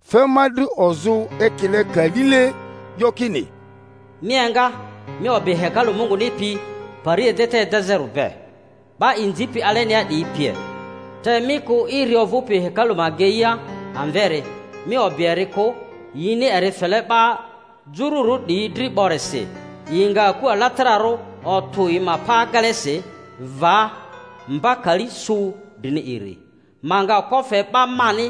Fe ma dri ozᴜ ekile kalile, 'yo kini: Mi enga, mi o'bi hekalu Munguni pi, pari edeta edezᴜri be, 'ba inzipi alenia 'diyi pie, te mi kᴜ irii ovᴜpi hekalu ma ageia amveri; mi o'bi eri kᴜ, yini eri fele 'ba jururᴜ 'diyi dri 'borisi, yi nga aku alatararᴜ otᴜ yi pa agelesi va mba kali su drini iri. Ma nga okpo fe 'ba mani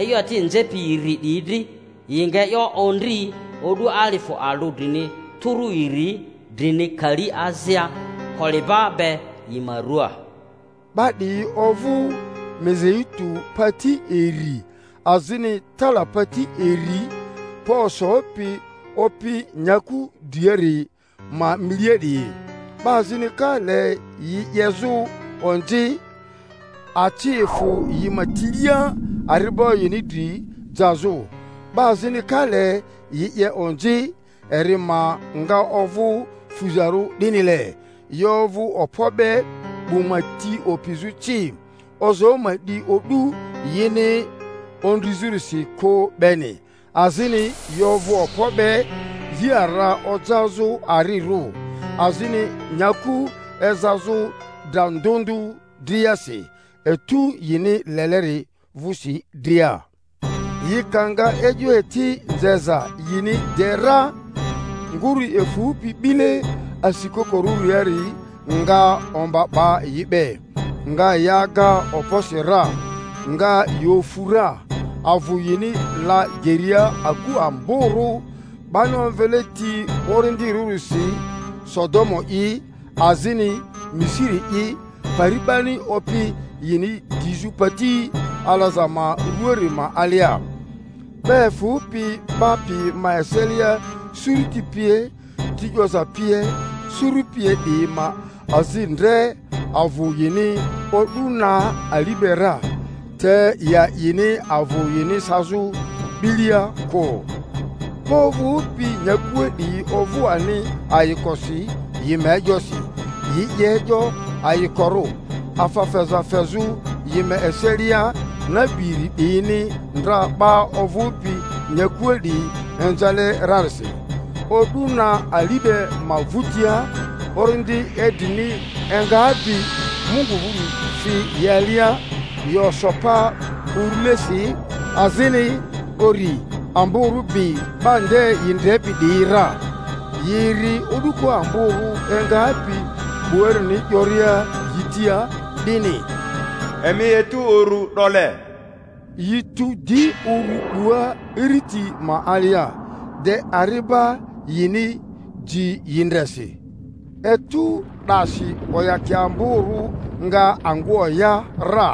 e'yo eti nzepi iri 'diyi dri, yi nga e'yo ondri o'du alifᴜ alᴜ drini tᴜrᴜ iri drini kali azia, koliba be yi ma rᴜaa. 'Ba 'diyi ovᴜ mizeitu pati iri azini talapati iri, pa osopi Opi nyaku driliari ma milia 'diyi. 'Ba azini ka le yi 'yezᴜ onzi, aci efᴜ yi ma tilia ari'ba yini dri jazᴜ; 'ba azini ka le yi 'ye onzi, eri ma nga ovᴜ fuzarᴜ 'dinile. Yi ovᴜ okpo be 'bu ma ti opizᴜ ci, ozoo ma 'di o'du yini ondrizᴜrisi kᴜ beni, azini yi ovᴜ okpo be yi ara ojazᴜ arirᴜ, azini nyaku ezazᴜ dra ndᴜ ndᴜ driasi, etu yini leleri vᴜsi dria. Yi ka nga e'yo eti nzeza yini de ra, nguru efᴜpi 'bile asi-kokorᴜriari nga omba 'ba yi be, nga yi aga okposi ra, nga yi ofu ra, avᴜ yini la geria aku amborᴜ 'bani omvele ti orindirᴜrisi Sodomu'i azini Misiri’i, pari 'bani Opi yini 'dizᴜ pati alaza ma rᴜaari ma alia. 'Ba efᴜpi 'ba piyi ma eselia, suruti pie, ti 'yoza pie, suru pie 'diyi ma azi ndre avᴜ yini o'du na ali be ra, te yi a'ini avᴜ yini sazᴜ 'bilia kᴜ. 'Ba ovᴜpi nyakua 'diyi ovᴜ ani ayikosi yi ma e'yosi, yi 'ye e'yo ayikorᴜ, afa feza fezᴜ yi ma eselia, nabi iri 'diyini ndra 'ba ovᴜpi nyakua 'diyi inzale rarisi. O'du na ali be ma vᴜtia orindi idrini engapi Mungu vᴜri fi yi alia, yi oso pa urᴜlesi; azini uri amborᴜ bi 'ba nde yi ndrepi 'diyi ra. Yi eri o'duko amborᴜ engapi 'buarini 'yoria yi tia, 'dini, Emi etu urᴜ 'dole! Yi tu di uru 'bua iriti ma alia, de ari'ba yini ji yi ndre si. Etu 'dasi oyakia amborᴜ nga angᴜ oya ra,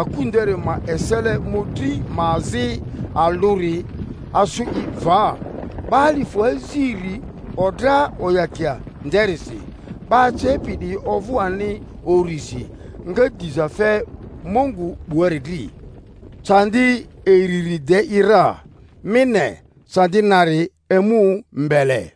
aku nderi ma esele mᴜdri ma azi alᴜri asᴜ i va; 'ba alifᴜ aziri odra oyakia nderisi, 'ba acepi 'diyi ovᴜ ani urisi, nga diza fe Mungu 'buari dri. Candi iriri de i ra; mi ne, candi nari emu mbele.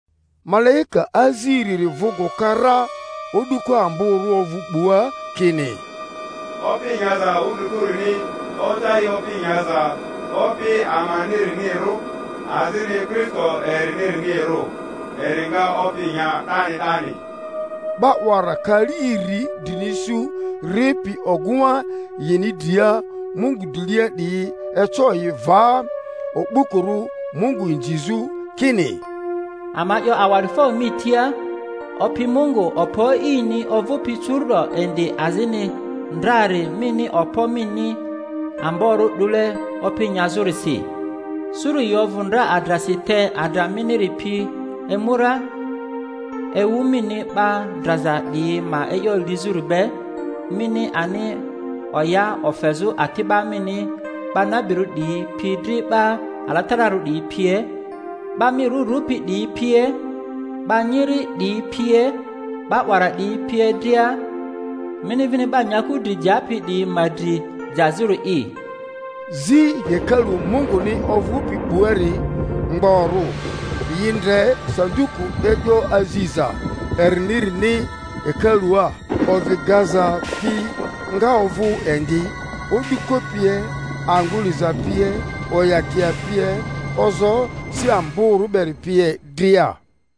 Malaika aziriri vᴜ gᴜka ra, o'duko amborᴜ ovᴜ 'bua kini, Opi nyaza wudrikuruni oja i opi nyaza Opi amanirinirᴜ, azini Kristo erini-rinirᴜ, eri nga opi nya 'dani 'dani. 'Ba 'wara kali iri drini su ripi ogᴜŋa yini dria Mungu drilia 'diyi eco yi va o'bukurᴜ Mungu inzizᴜ, kini, Ama 'yo awa'difo mi tia, Opi Mungu, Okpo E'ini, ovᴜpi curu’do indi azini ndrari, mini okpo mini amborᴜ 'dule opi nyazᴜrisi. Suru yi ovᴜ ndra adrasi, te adra miniri pi emu ra, ewu mini 'ba draza 'diyi ma e'yo lizᴜri be, mini ani oya ofezᴜ ati'ba mini 'ba nabirᴜ 'diyi pi dri 'ba alatararᴜ 'diyi pie, 'ba mi rᴜ rᴜpi 'diyi pie, 'ba nyiri 'diyi pie 'ba 'wara 'diyi pie dria, mini vini 'ba nyaku dri japi 'diyi ma dri jazᴜri'i. Zi hekalu Munguni ovᴜpi 'buari mgborᴜ, yi ndre sanduku e'yo aziza erinirini hekalua; ovi gaza pi nga ovᴜ indi o'duko pie, angᴜ liza pie, oyakia pie, ozoo si amborᴜ beri pie dria.